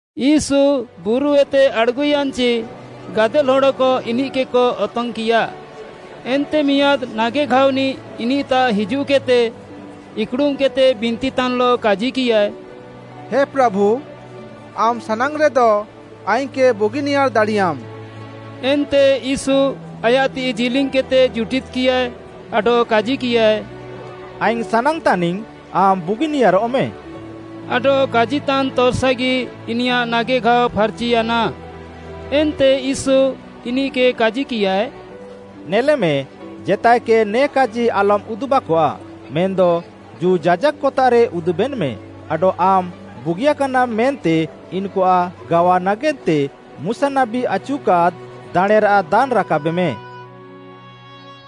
ୟୀଶୁ ବୁରୁଏତେ ଆଡ଼୍‌ଗୁୟାନ୍‌ଚି, ଗାଦେଲ୍‌ ହଡ଼କ ଇନିଃକେକ ଅତଙ୍ଗ୍‌କିୟା। ଏନ୍ତେ ମିଆଁଦ୍‌ ନାଗେଘାଅନିଃ ଇନିଃତାଃ ହିଜୁଃକେଦ୍‌ତେ, ଇକ୍‌ଡ଼ୁମ୍‌କେଦ୍‌ତେ ବିନ୍ତିତାନ୍‌ଲଃ କାଜିକିୟାଏ, “ହେ ପ୍ରାଭୁ, ଆମ୍‌ ସାନାଙ୍ଗ୍‌ରେଦ ଆଇଙ୍ଗ୍‌କେ ବୁଗିନିୟାର୍‌ ଦାଡ଼ିୟାମ୍‌।” ଏନ୍ତେ ୟୀଶୁ ଆୟାଃ ତିଃଇ ଜିଲିଙ୍ଗ୍‌କେଦ୍‌ତେ ଜୁଟିଦ୍‌କିୟାଏ ଆଡଃ କାଜିକିୟାଏ, “ଆଇଙ୍ଗ୍‌ ସାନାଙ୍ଗ୍‌ତାନିଙ୍ଗ୍‌ ଆମ୍‌ ବୁଗିନିୟାରଃମେ।” ଆଡଃ କାଜିତାନ୍ ତର୍‌ସାଗି ଇନିୟାଃ ନାଗେଘାଅ ଫାର୍‌ଚିୟାନା। ଏନ୍ତେ ୟୀଶୁ ଇନିଃକେ କାଜିକିୟାଏ, “ନେଲେମେ, ଜେତାଏକେ ନେ କାଜି ଆଲମ୍‌ ଉଦୁବ୍‌କଆଃ, ମେନ୍‌ଦ, ଜୁ, ଯାଜାକ୍‌ତାଃରେ ଉଦୁବେନ୍‌ମେ ଆଡଃ ଆମ୍‌ ବୁଗିୟାକାନାମ୍‌ ମେନ୍ତେ ଇନ୍‌କୁଆଃ ଗାୱା ନାଗେନ୍ତେ ମୁଶା ନାବୀ ଆଚୁକାଦ୍‌ ଦାଣେଁରାଃ ଦାନ୍‌ ରାକାବେମେ।”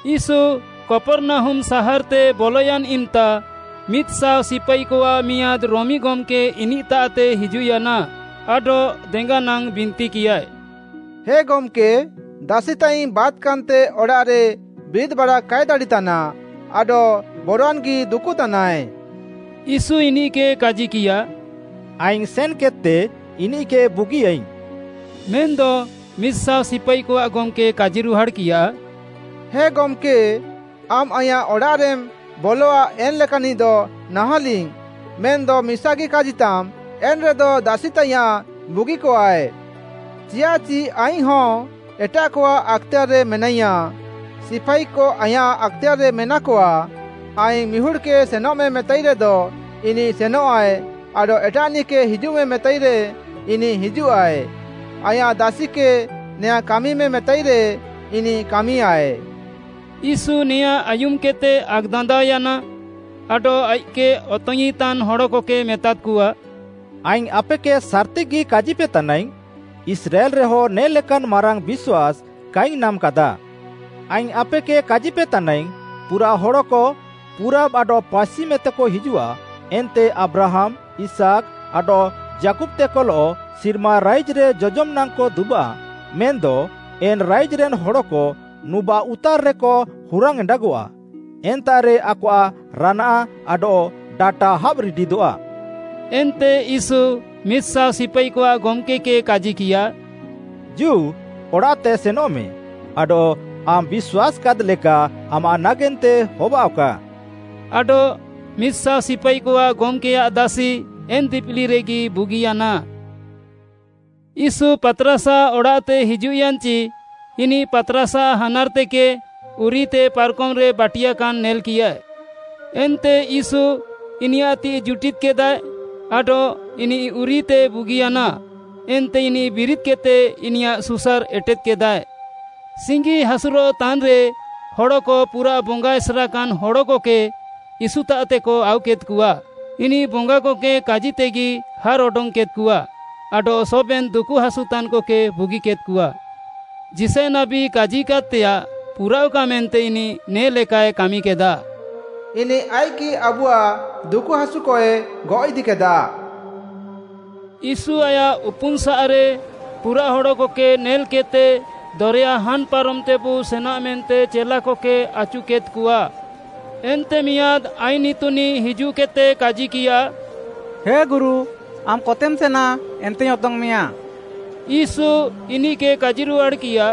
ୟୀଶୁ କପର୍‌ନାହୁମ୍‌ ସାହାର୍‌ତେ ବଲୟାନ୍‌ ଇମ୍‌ତା ମିଦ୍‌ଶାଅ ସିପାଇକଆଃ ମିଆଁଦ୍‌ ରୋମି ଗମ୍‌କେ ଇନିଃତାଃତେ ହିଜୁଃୟାନା ଆଡଃ ଦେଙ୍ଗାନାଙ୍ଗ୍‌ ବିନ୍ତିକିୟାଏ, “ହେ ଗମ୍‌କେ, ଦାସିତାଇଙ୍ଗ୍‌ ବାତ୍‌କାନ୍‌ତେ ଅଡ଼ାଃରେ ବିରିଦ୍‍ବାଡ଼ା କାଏ ଦାଡ଼ିତାନ୍‌ ଆଡଃ ବରୱାନ୍‌ଗି ଦୁକୁତାନାଏ।” ୟୀଶୁ ଇନିଃକେ କାଜିକିୟା, “ଆଇଙ୍ଗ୍‌ ସେନ୍‌କେଦ୍‌ତେ ଇନିଃକେ ବୁଗିଆଇଙ୍ଗ୍‌।” ମେନ୍‌ଦ ମିଦ୍‌ଶାଅ ସିପାଇକଆଃ ଗମ୍‌କେ କାଜିରୁହାଡ଼୍‌କିୟା, “ହେ ଗମ୍‌କେ, ଆମ୍‌ ଆଇଁୟାଃ ଅଡ଼ାଃରେମ୍‌ ବଲଆ ଏନ୍‌ ଲେକାନ୍‌ନିଃଦ ନାହାଁଲିଙ୍ଗ୍‌, ମେନ୍‌ଦ ମିସାଗି କାଜିତାମ୍‌ ଏନ୍‌ରେଦ ଦାସି ତାଇୟାଁଃ ବୁଗିକଆଃଏ। ଚିୟାଃଚି ଆଇଙ୍ଗ୍‌ହଁ ଏଟାଃକଆଃ ଆକ୍‌ତେୟାର୍‌ରେ ମେନାଇୟାଁଃ, ସିପାଇକ ଆଇଁୟାଃ ଆକ୍‌ତେୟାର୍‌ରେ ମେନାକଆଃ। ଆଇଙ୍ଗ୍‌ ମିହୁଡ଼୍‌କେ ସେନଃମେ ମେତାଇରେଦ ଇନିଃ ସେନଃଆଏ ଆଡଃ ଏଟାଃନିଃକେ ହିଜୁଃମେ ମେତାଇରେ ଇନିଃ ହିଜୁଃଆଏ। ଆଇଁୟାଃ ଦାସିକେ ନେୟାଁ କାମିମେ ମେତାଇରେ ଇନିଃ କାମିୟାଏ।” ୟୀଶୁ ନେଆଁଁ ଆୟୁମ୍‌କେଦ୍‌ତେ ଆକ୍‌ଦାନ୍ଦାଅୟାନା ଆଡଃ ଆଇଃକ୍‌କେ ଅତଙ୍ଗ୍‌ଇଁତାନ୍‌ ହଡ଼କକେ ମେତାଦ୍‌କଆ, “ଆଇଙ୍ଗ୍‌ ଆପେକେ ସାର୍‌ତିଗି କାଜିପେତାନାଇଙ୍ଗ୍‌, ଇସ୍ରାଏଲ୍‌ରେହ ନେ ଲେକାନ୍‌ ମାରାଙ୍ଗ୍‌ ବିଶ୍ୱାସ୍‌ କାଇଙ୍ଗ୍‌ ନାମ୍‌କାଦା। ଆଇଙ୍ଗ୍‌ ଆପେକେ କାଜିପେତାନାଇଙ୍ଗ୍‌, ପୁରାଃ ହଡ଼କ ପୁରାବ୍‌ ଆଡଃ ପାଶ୍ଚିମ୍‌ଏତେକ ହିଜୁଃଆ, ଏନ୍ତେ ଆବ୍ରାହାମ୍‌, ଇସାକ୍‌, ଆଡଃ ଯାକୁବ୍‌ତେକଲଃ ସିର୍ମା ରାଇଜ୍‌ରେ ଜଜମ୍‌ ନାଙ୍ଗ୍‌କ ଦୁବାଃ, ମେନ୍‌ଦ ଏନ୍‌ ରାଇଜ୍‌ରେନ୍‌ ହନ୍‌କ ନୁବାଃଉତାର୍‌ରେକ ହୁରାଙ୍ଗ୍‌ ଏଣ୍ଡାଗଆଃ। ଏନ୍ତାଃରେ ଆକଆଃ ରାନାଆଃ ଆଡଃ ଡାଟା ହାବ୍‌ ରିଡିଦଃଆ।” ଏନ୍ତେ ୟୀଶୁ ମିଦ୍‌ ସାଅ ସିପାଇକଆଃ ଗମ୍‌କେ କେ କାଜିକିୟା, “ଜୁ ଅଡ଼ାଃତେ ସେନଃମେ, ଆଡଃ ଆମ୍‌ ବିଶ୍ୱାସ୍‌କାଦ୍‌ ଲେକା ଆମାଃ ନାଗେନ୍ତେ ହବାଅଃକା।” ଆଡଃ ମିଦ୍‌ ସାଅ ସିପାଇକଆଃ ଗମ୍‌କେୟାଃ ଦାସି ଏନ୍‌ ଦିପିଲିରେଗି ବୁଗିୟାନା। ୟୀଶୁ ପାତ୍‌ରାସ୍‌ଆଃ ଅଡ଼ାଃତେ ହିଜୁଃୟାନ୍‌ଚି, ଇନିଃ ପାତ୍‌ରାସ୍‌ଆଃ ହାନାର୍‌ତେକେ ଉରିୟୁତେ ପାର୍‌କମ୍‌ରେ ବାଟିୟାକାନ୍‌ ନେଲ୍‌କିୟାଏ। ଏନ୍ତେ ୟୀଶୁ ଇନିୟାଃ ତିଃଇ ଜୁଟିଦ୍‌କେଦାଏ ଆଡଃ ଇନିଃ ଉରିୟୁଏତେ ବୁଗିୟାନା, ଏନ୍ତେ ଇନିଃ ବିରିଦ୍‌କେଦ୍‌ତେ ଇନିୟାଃ ସୁସାର୍‌ ଏଟେଦ୍‌କେଦାଏ। ସିଙ୍ଗିହାସୁରଃ ତାନ୍‌ରେ ହଡ଼କ ପୁରାଃ ବଙ୍ଗା ଏସେର୍‌କାନ୍‌ ହଡ଼କକେ ୟୀଶୁତାଃତେକ ଆଉକେଦ୍‌କଆ। ଇନିଃ ବଙ୍ଗାକକେ କାଜିତେଗି ହାର୍‌ ଅଡଙ୍ଗ୍‌କେଦ୍‌କଆ ଆଡଃ ସବେନ୍‌ ଦୁକୁହାସୁତାନ୍‌କକେ ବୁଗିକେଦ୍‌କଆ। ଯିଶାୟ ନାବୀ କାଜିକାଦ୍‌ତେୟାଃ ପୁରାଅଃକା ମେନ୍ତେ ଇନିଃ ନେ ଲେକାଏ କାମିକେଦା, “ଇନିଃ ଆଇଃକ୍‌ଗି ଆବୁଆଃ ଦୁକୁହାସୁକଏ ଗଅଃଇଦିକେଦା।” ୟୀଶୁ ଆୟାଃ ଉପୁନ୍‌ସାଃରେ ପୁରାଃ ହଡ଼କକେ ନେଲ୍‌କେଦ୍‌ତେ ଦରେୟା ହାନ୍‌ ପାରମ୍‌ତେବୁ ସେନା ମେନ୍ତେ ଚେଲାକକେ ଆଚୁକେଦ୍‌କଆ। ଏନ୍ତେ ମିଆଁଦ୍‌ ଆଇନ୍‌ ଇତୁନିଃ ହିଜୁଃକେଦ୍‌ତେ କାଜିକିୟା, “ହେ ଗୁରୁ, ଆମ୍‌ କତେମ୍‌ ସେନା ଏନ୍ତେଇଙ୍ଗ୍‌ ଅତଙ୍ଗ୍‌ମେୟାଁ।” ୟୀଶୁ ଇନିଃକେ କାଜିରୁହାଡ଼୍‌କିୟା,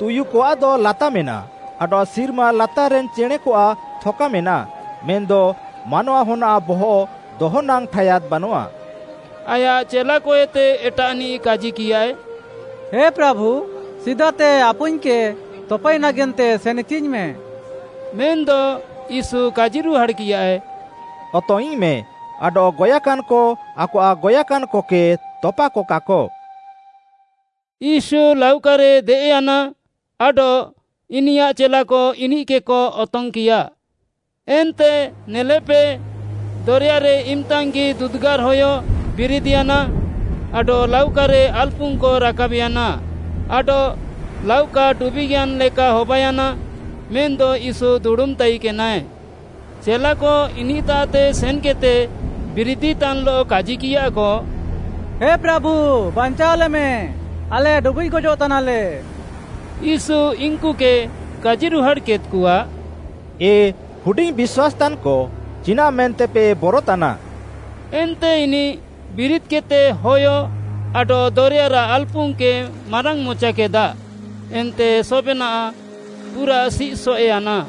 “ତୁୟୁକଆଃଦ ଲାତା ମେନାଃ ଆଡଃ ସିର୍ମା ଲାତାର୍‌ରେନ୍‌ ଚେଣେଁକଆଃ ଥକା ମେନାଃ ମେନ୍‌ଦ ମାନୱାହନ୍‌ଆଃ ବହଃ ଦହନାଙ୍ଗ୍‌ ଠାୟାଦ୍‌ ବାନଆଃ।” ଆୟାଃ ଚେଲାକଏତେ ଏଟାଃନିଃ କାଜିକିୟାଏ, “ହେ ପ୍ରାଭୁ, ସିଦାତେ ଆପୁଇଙ୍ଗ୍‌କେ ତପାଇ ନାଗେନ୍ତେ ସେନ୍‌ଇଚିଙ୍ଗ୍‌ମେ।” ମେନ୍‌ଦ ୟୀଶୁ କାଜିରୁହାଡ଼୍‌କିୟାଏ, “ଅତଙ୍ଗ୍‌ଇଙ୍ଗ୍‌ମେ, ଆଡଃ ଗଏଃକାନ୍‌କ ଆକଆଃ ଗଏଃକାନ୍‌କକେ ତପାକକାକ।” ୟୀଶୁ ଲାଉକାରେ ଦେଏଃୟାନା ଆଡଃ ଇନିୟାଃ ଚେଲାକ ଇନିଃକେକ ଅତଙ୍ଗ୍‌କିୟା। ଏନ୍ତେ ନେଲେପେ, ଦରେୟାରେ ଇମ୍‌ତାଙ୍ଗ୍‌ଗି ଦୁଦୁଗାର୍‌ହୟ ବିରିଦ୍‌ୟାନା ଆଡଃ ଲାଉକାରେ ଆଲ୍‌ପୁଙ୍ଗ୍‌କ ରାକାବ୍‌ୟାନା, ଆଡଃ ଲାଉକା ଡୁବିଃଗ୍‌ୟାନ୍‌ ଲେକା ହବାୟାନା। ମେନ୍‌ଦ ୟୀଶୁ ଦୁଡ଼ୁମ୍‌ ତାଇକେନାଏ। ଚେଲାକ ଇନିଃତାଃତେ ସେନ୍‌କେଦ୍‌ତେ ବିରିଦିତାନ୍‌ଲଃ କାଜିକିୟାକ, “ହେ ପ୍ରାଭୁ, ବାଞ୍ଚାଅଲେମେ, ଆଲେ ଡୁବିଃଗ୍‌ ଗଜଃତାନାଲେ!” ୟୀଶୁ ଇନ୍‌କୁକେ କାଜିରୁହାଡ଼୍‌କେଦ୍‌କଆ, “ଏ ହୁଡିଙ୍ଗ୍‌ ବିଶ୍ୱାସ୍‌ତାନ୍‌କ, ଚିନାଃ ମେନ୍ତେପେ ବରତାନା।” ଏନ୍ତେ ଇନିଃ ବିରିଦ୍‌କେଦ୍‌ତେ ହୟ ଆଡଃ ଦରେୟାରାଃ ଆଲ୍‌ପୁଙ୍ଗ୍‌କେ ମାରାଙ୍ଗ୍‌ମଚାକେଦା, ଏନ୍ତେ ସବେନାଃ ପୁରା ସିଃସଏଃୟାନା।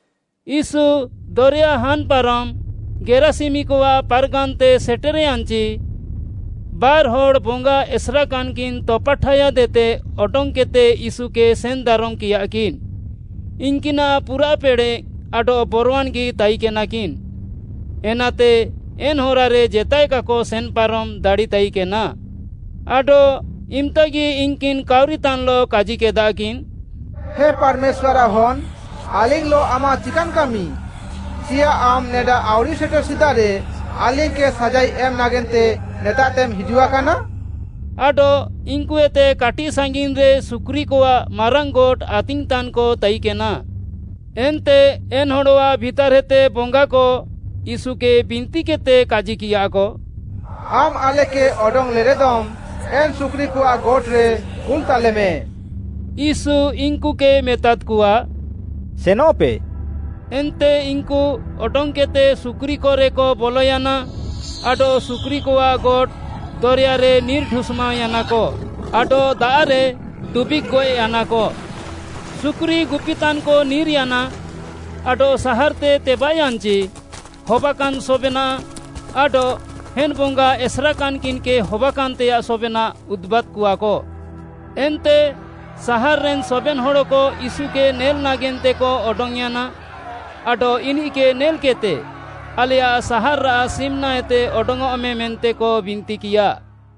ୟୀଶୁ ଦରେୟା ହାନ୍‌ ପାରମ୍‌ ଗେରାସିମିକଆଃ ପାର୍‌ଗାନ୍‌ତେ ସେଟେର୍‌ୟାନ୍‌ଚି, ବାର୍‌ହଡ଼୍‌ ବଙ୍ଗା ଏସେର୍‌କାନ୍‌କିନ୍‌ ତପାଠାୟାଦ୍‌ଏତେ ଅଡଙ୍ଗ୍‌କେଦ୍‌ତେ ୟୀଶୁକେ ସେନ୍‌ଦାରମ୍‌କିୟାକିନ୍‌। ଇନ୍‌କିନାଃ ପୁରାଃ ପେଡ଼େଃ ଆଡଃ ବରୱାନ୍‌ଗି ତାଇକେନାକିନ୍‌, ଏନାତେ ଏନ୍‌ ହରାରେ ଜେତାଏ କାକ ସେନ୍‌ପାରମ୍‌ ଦାଡ଼ିତାଇକେନା। ଆଡଃ ଇମ୍‌ତାଗି ଇନ୍‌କିନ୍‌ କାଉରିତାନ୍‌ଲଃ କାଜିକେଦାକିନ୍‌, “ହେ ପାର୍‌ମେଶ୍ୱାର୍‌ଆଃ ହନ୍‌, ଆଲିଙ୍ଗ୍‌ଲଃ ଆମାଃ ଚିକାନ୍‌ କାମି? ଚିୟାଃ ଆମ୍‌ ନେଡା ଆଉରି ସେଟେର୍‌ ସିଦାରେ ଆଲିଙ୍ଗ୍‌କେ ସାଜାଇ ଏମ୍‌ ନାଗେନ୍ତେ ନେତାଃତେମ୍‌ ହିଜୁଆକାନା?” ଆଡଃ ଇନ୍‌କୁଏତେ କାଟିଃ ସାଙ୍ଗିନ୍‌ରେ ସୁକୁରିକଆଃ ମାରାଙ୍ଗ୍‌ ଗୋଟ୍‌ ଆତିଙ୍ଗ୍‌ତାନ୍‌କ ତାଇକେନା। ଏନ୍ତେ ଏନ୍‌ ହଡ଼ଆଃ ଭିତାର୍‌ଏତେ ବଙ୍ଗାକ ୟୀଶୁକେ ବିନ୍ତିକେଦ୍‌ତେ କାଜିକିୟାକ, “ଆମ୍‌ ଆଲେକେ ଅଡଙ୍ଗ୍‌ଲେରେଦମ୍‌ ଏନ୍‌ ସୁକୁରିକଆଃ ଗୋଟ୍‌ରେ କୁଲ୍‌ତାଲେମେ।” ୟୀଶୁ ଇନ୍‌କୁକେ ମେତାଦ୍‌କଆ, “ସେନଃପେ।” ଏନ୍ତେ ଇନ୍‌କୁ ଅଡଙ୍ଗ୍‌କେଦ୍‌ତେ ସୁକୁରିକରେକ ବଲୟାନା, ଆଡଃ ସୁକୁରିକଆଃ ଗୋଟ୍‌, ଦରେୟାରେ ନିର୍‌ ଢୁଷ୍‌ମାଅୟାନାକ ଆଡଃ ଦାଆଃରେ ଡୁବିଃଗ୍‌ ଗଏଃୟାନାକ। ସୁକୁରି ଗୁପିତାନ୍‌କ ନିର୍‌ୟାନା ଆଡଃ ସାହାର୍‌ତେ ତେବାଃୟାନ୍‌ଚି, ହବାକାନ୍‌ ସବେନାଃ ଆଡଃ ଏନ୍‌ ବଙ୍ଗା ଏସେର୍‌କାନ୍‌କିନ୍‌କେ ହବାକାନ୍‌ତେୟାଃ ସବେନାଃ ଉଦୁବାଦ୍‍କଆକ। ଏନ୍ତେ ସାହାର୍‌ରେନ୍‌ ସବେନ୍‌ ହଡ଼କ ୟୀଶୁକେ ନେଲ୍‌ ନାଗେନ୍ତେକ ଅଡଙ୍ଗ୍‌ୟାନା ଆଡଃ ଇନିଃକେ ନେଲ୍‌କିଃତେ, ଆଲେୟାଃ ସାହାର୍‌ରାଃ ସିମ୍‌ନାଏତେ ଅଡଙ୍ଗ୍‌ଅଃମେ ମେନ୍ତେକ ବିନ୍ତିକିୟା।